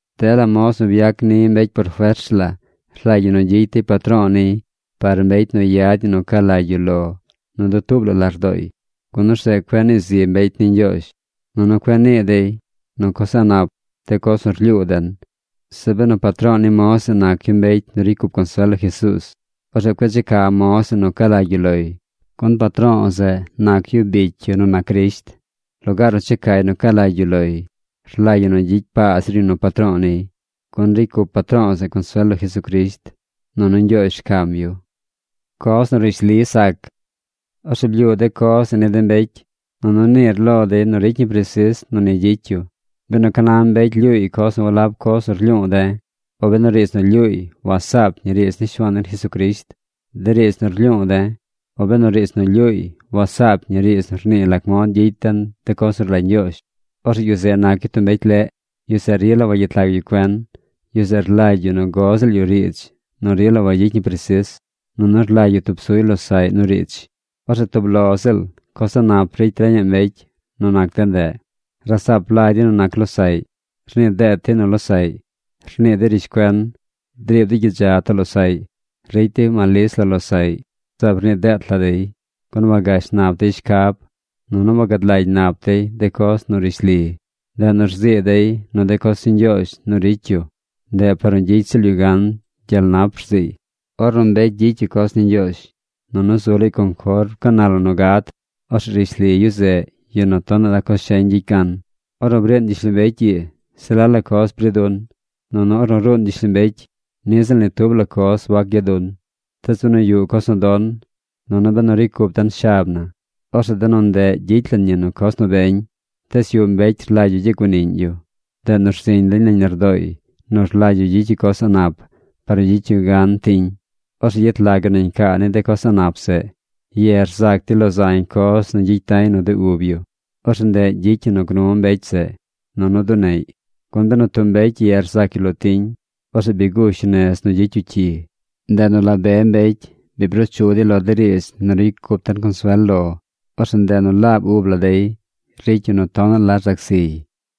Dela moz nu byac ni mbecy por fers la rlagy ñi nu gyicy dey patro̱o̱ niy par mbecy nu yad ñi ni nu ca lagy yu lo nu dutuub la lardooy, gun orzeꞌ cueꞌ nii zi mbecy ni Ñgyoozh nunu cueꞌ nii dey nu coz a̱ꞌ nap de coz nu rlyuu den. Zeꞌ benu patro̱o̱ ni moz zeꞌ nac yu mbecy nu ricy cup consuel lo Jesuuz, orzeꞌ cueꞌ checa moz zeꞌ nu ca lagy yu loy, gun patro̱o̱ zeꞌ nac yu bicy yu nu nac Crisht. Lugaar nu checay nu ca lagy yu loy, rlagy ñi nu gyicy paa zir yu nu patro̱o̱ niy. Gun ricy cup patro̱o̱ zeꞌ consuel lo Jesucrisht, nunu Ñgyoozh rcam yu. Coz nu rishli sac Orzeꞌ blyuu de coz zeꞌ ni de mbecy, nunu niir lo dey nu ricy ñi presis nu ni gyicy yu. Benu ca na mbecy lyuuy coz nu walab coz nu rlyuu de̱, o benu riidz nu lyuuy wasaap ñi riidz ni Shuaan den Jesucrisht, de riidz nu rlyuu de̱, o benu riidz nu lyuuy wasaap ñi riidz nu rnii lac mod gyicy den de coz nu rlagy Ñgyoozh, orzeꞌ yu zeꞌ nac yu tub mbecy leꞌ. Yu zeꞌ rila wagyet lag yu cuen. Yu zeꞌ rlagy yu nu go ziꞌl yu riidz nu rila wagyicy ñi presis. Nunu rlagy yu tub suy losaꞌy nu riidz. Orzeꞌ tub lo ziꞌl coz a̱ꞌ nap ricy reñaꞌ mbecy nu nac de ndeꞌ. Rasaap lagy dey nu nac losaꞌy. Rnii deet dey nu losaꞌy. Rnii dey rishcuen. Driib dey gyidza too losaꞌy. Ricy dey malis lo losaꞌy. Zaab rnii deet la dey, gun wagash nap dey shcab, nunu wagad lagy nap dey de coz nu rishli. Ndeꞌ nu rzii dey nu de coz ni Ñgyoozh nu ricy yu, ndeꞌ par nu gyicy ziꞌl yu gan gyel nap rziiy. Ornu mbecy gyicy yu coz ni Ñgyoozh, nunu zu laay conform ca na la nu gad, orzeꞌ rishli yu zeꞌ yu nu tonaꞌ la coz sheñ gyicy gan. Ornu briin gyishlombecy ii, se la la coz bri dun. Nunu ornu ruun gyishlombecy, niꞌ ziꞌl ni tub la coz wac gya dun. Tees benu yuꞌ coz nu don, nunu benu ricy cup den shab na, orzeꞌ de nu ndeꞌ gyicy lan ñi nu coz nu beñ. Tees yuꞌ mbecy rlagy yu gyaguaniꞌñ yu. Ndeꞌ nu rziñ lañ nañ lardooy nu rlagy yu gyicy yu coz a̱ꞌ nap par nu gyicy yu gan tiñ. Orzeꞌ yet lag yu nañ caa ni de coz a̱ꞌ nap zeꞌ. Ye rzac dey lo zañ coz nu gyicy da̱y nu de ub yu. Orzeꞌ ndeꞌ gyicy ñi nu gnu mbecy zeꞌ, nunu duneꞌy. Gun benu tub mbecy ye rzac yu lo tiñ, orzeꞌ bi gush yu nez nu gyicy yu cyi. Ndeꞌ nu la be mbecy bi bruu chu dey lo de riidz nu ricy cup den consuel lo. Orzeꞌ ndeꞌ nu laab ub la dey ricy yu nu tonaꞌ la rzac ziy.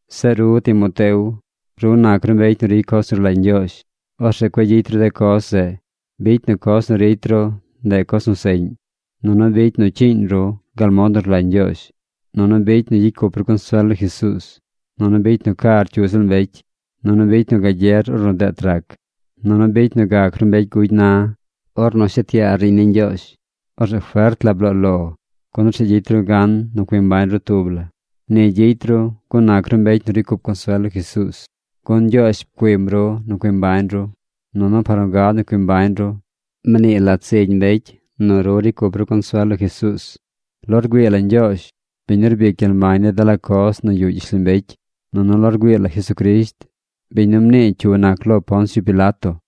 Zeꞌ ru Timoteo, ru nac ru mbecy nu ricy coz nu rlagy Ñgyoozh. Orzeꞌ cueꞌ gyicy ru de coz zeꞌ. Bicy nu coz nu ricy ru, ndeꞌ coz nu seꞌñ. Nunu bicy nu cyiiñ ru gal mod nu rlagy Ñgyoozh. Nunu bicy nu gyicy cup ru consuel lo Jesuuz. Nunu bicy nu car cyu ziꞌl mbecy. Nunu bicy nu gagyer ornu deet rac. Nunu bicy nu gac ru mbecy gugy na. Ornu shet yaar riiñ ni Ñgyoozh, orzeꞌ fert la bloo lo, gun orzeꞌ gyicy ru gan nu cui mbañ ru tub la. Ni gyicy ru gun nac ru mbecy nu ricy cup consuel lo Jesuuz, gun Ñgyoozh pcuim ru nu cui mbañ ru, nunu par nu gad nu cui mbañ ru, mnii lat zigy mbecy nu ru ricy cup ru consuel lo Jesuuz. Lo rgüii la Ñgyoozh, biñ nu rbic gyel mbañ ni dela coz nu yuꞌ gyishlombecy, nunu lo rgüii la Jesucrisht, biñ nu mnii cyu nac lo Poncio Pilato,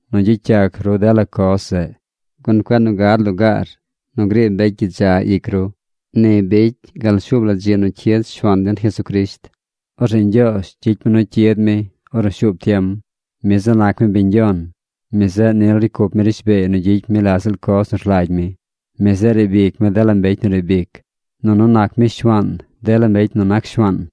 nu gyicy yac ru dela coz zeꞌ. Gun cueꞌ nu gad lugaar nu griib mbecy gyidza ic ru. Ni bicy gal shuub la dzi nu cyid Shuaan den Jesucrisht. Orzeꞌ Ñgyoozh gyicy mi nu cyid mi ornu shuub tiem. Mi zeꞌ nac mi Biñ yon. Mi zeꞌ nil ricy cup mi rishbeey nu gyicy mi la ziꞌl coz nu rlagy mi. Mi zeꞌ riib ic mi dela mbecy nu riib ic. Nunu nac mi Shuaan dela yu nu nac shuaan.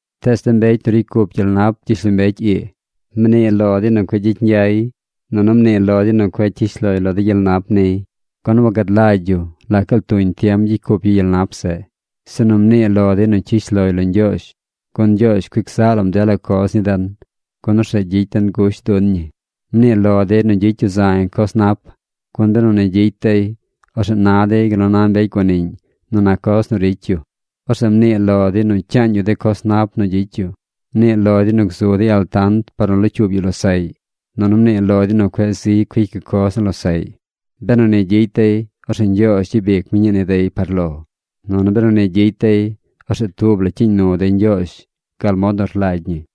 Tees de mbecy nu ricy cup gyel nap gyishlombecy ii, mnii lo dey nu cueꞌ gyicy ñgyay. Nunu mnii lo dey nu cueꞌ cyish loy lo gyel nap niy. Gun wagad lagy yu lac gaal tuñ tiem gyicy cup yu gyel nap zeꞌ. Sinu mnii lo dey nu cyish loy lo Ñgyoozh. Gun Ñgyoozh cuic zaꞌ lam dela coz ni den, gun orzeꞌ gyicy den gusht dun ñi. Mnii lo dey nu gyicy yu zañ coz nap. Gun benu ni gyicy dey, orzeꞌ na dey gal nu na mbecy guaniꞌñ nu nac coz nu ricy yu. Orzeꞌ mnii lo dey nu cyaañ yu de coz nap nu gyicy yu. Mnii lo dey nu gzu dey altant par nu locyuub yu losaꞌy, nunu mnii lo dey nu cueꞌ ziy cuic yu coz ni losaꞌy. Benu ni gyicy dey, orzeꞌ Ñgyoozh gyabic mi ñii ni dey par lo. Nunu benu ni gyicy dey, orzeꞌ tub la cyiiñ nu dey Ñgyoozh gal mod nu rlagy ñi.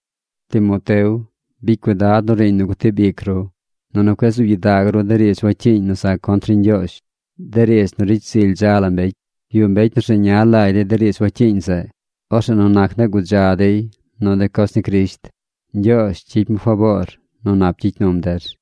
Timoteo, bicy cuidad nu riiñ nu gutib ic ru. Nunu cueꞌ zuub gyidag ru de riidz wacyiiñ nu za contr ni Ñgyoozh, de riidz nu ricy zily dza la mbecy. Yuꞌ mbecy nu rzeña lagy dey de riidz wacyiiñ zeꞌ. Orzeꞌ nu nac ndeꞌ gudza dey nu de coz ni Crisht. Ñgyoozh gyicy mi faboor nu nap gyicy num der.